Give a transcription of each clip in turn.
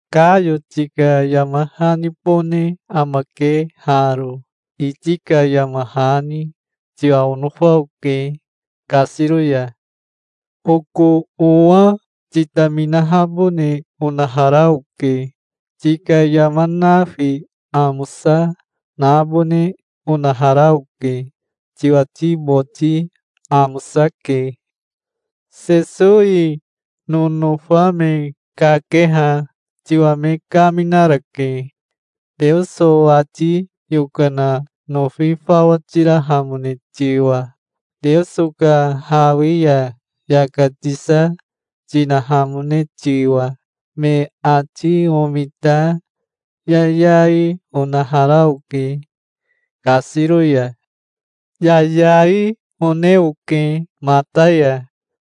Kayo tika yama hanibone amake haro, iti ka yama hani. Tiwa onofa oke kasiro ya. Oko owa, titaminahabone onahara oke. Tika yama nafi amosa nabone onahara oke. Tiwati boti amosake. Sesowi nonofa me kakeha tiwa me kaminarake, Teoso ati yokana nofi fawa tirahamone tiwa, Teoso ka hawi ya yaka tisa tinahamone tiwa. Me ati omita yayai onahara oke kasiro ya. Yayai one oke mata ya,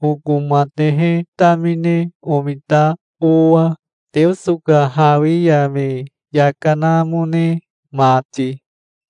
oko matehe tamine omita owa, Teoso ka hawi ya me yaka namone mati.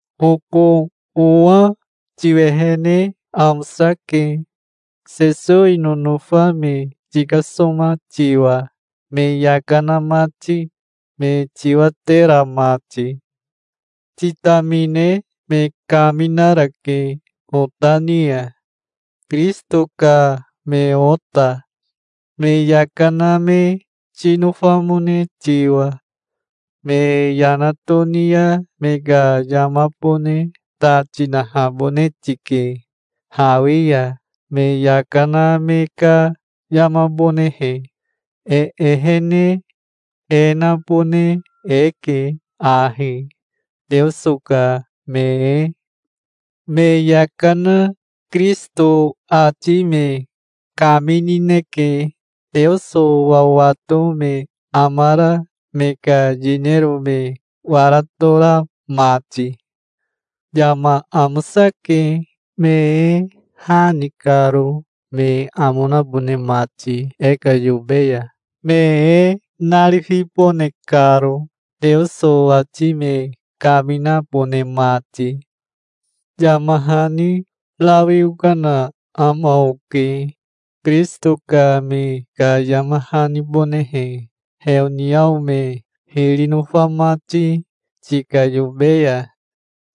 Oko owa tiwehene amosake, Sesowi nonofa me tikasoma tiwa, me yaka na mati, me tiwatera mati. Titamine me kaminarake ota ni ya, Kirisito ka me ota, me yaka na me tinofamone tiwa. Me yana toni ya me ka yamabone ta tinahabone tike, hawi ya me yaka na me ka yamabonehe. E ehene e nabone eke ahi, Teoso ka me e. Me yaka na Kirisito ati me kaminineke, Teoso wawato me amara me ka yinero me wara tora mati. Yama amosake, me e ha ni karo, me amo nabone mati e ka yobe ya, me e narifibone karo, Teoso ati me kaminabone mati. Yama hani rawi okana ama oke, Kirisito ka me ka yama hanibonehe, heoniao me hiri nofa mati tika yobe ya.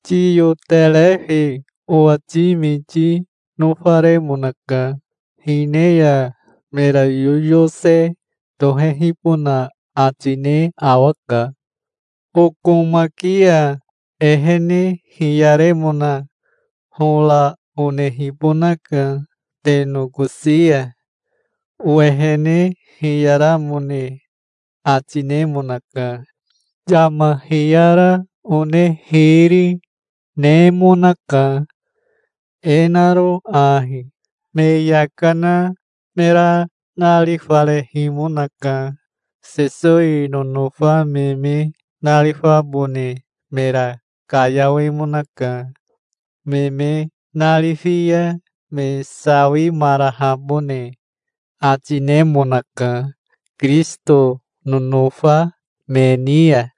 Tiyoterefi owati miti nofaremonaka. Hine ya mera yoyose tohehibona ati ne awaka. Okomaki ya ehene hiyaremona hora onehibonaka te nokosi ya. Owehene hiyaramone ati nemonaka. Yama hiyara one hiri, nemonaka, e naro ahi: me yaka na mera narifarehimonaka. Sesowi nonofa me me narifabone mera kayawemonaka. Me me narifi ya me sawimarahabone ati nemonaka Kirisito nonofa me ni ya.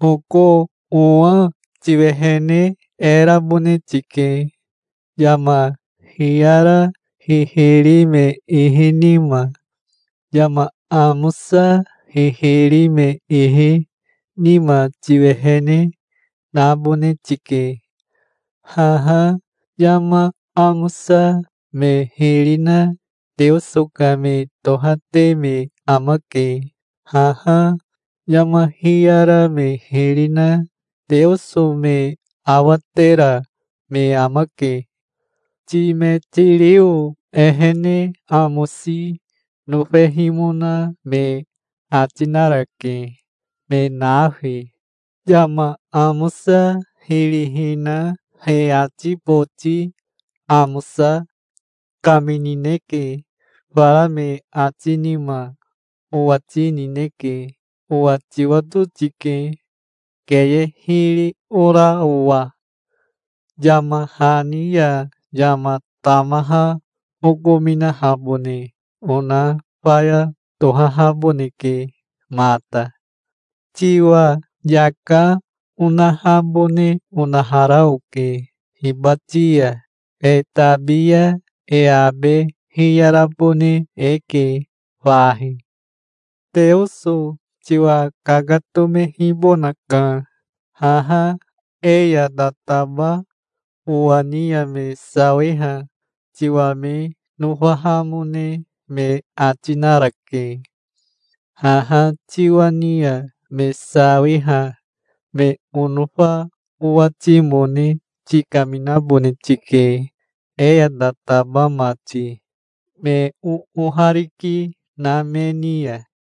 Oko owa tiwehene e rabone tike, yama hiyara hihiri me ihi nima. Yama amosa hihiri me ihi nima tiwehene nabone tike. Haha yama amosa me hiri na Teoso ka me tohate me amake. Haha yama hiyara me hiri na Teoso me awatera me amake. Timetirio ehene amosi nofehimona me ati narake, me nafi. Yama amosa hiri hina he ati boti amosa kaminineke. Fara me ati nima owati nineke. Owa tiwato tike, keye hiri ora owa. Yama hani ya yama tamaha okominahabone ona faya tohahaboneke mata. Tiwa yaka onahabone onahara oke hibati ya. E tabi ya e abe hiyarabone eke fahi. Teoso tiwa kakatomehibonaka. Haha e ya tataba owa ni ya me sawiha tiwa me nofahamone me ati narake. Haha tiwa ni ya me sawiha me onofa owatimone tikaminabone tike, e ya tataba mati, me oohariki na me ni ya.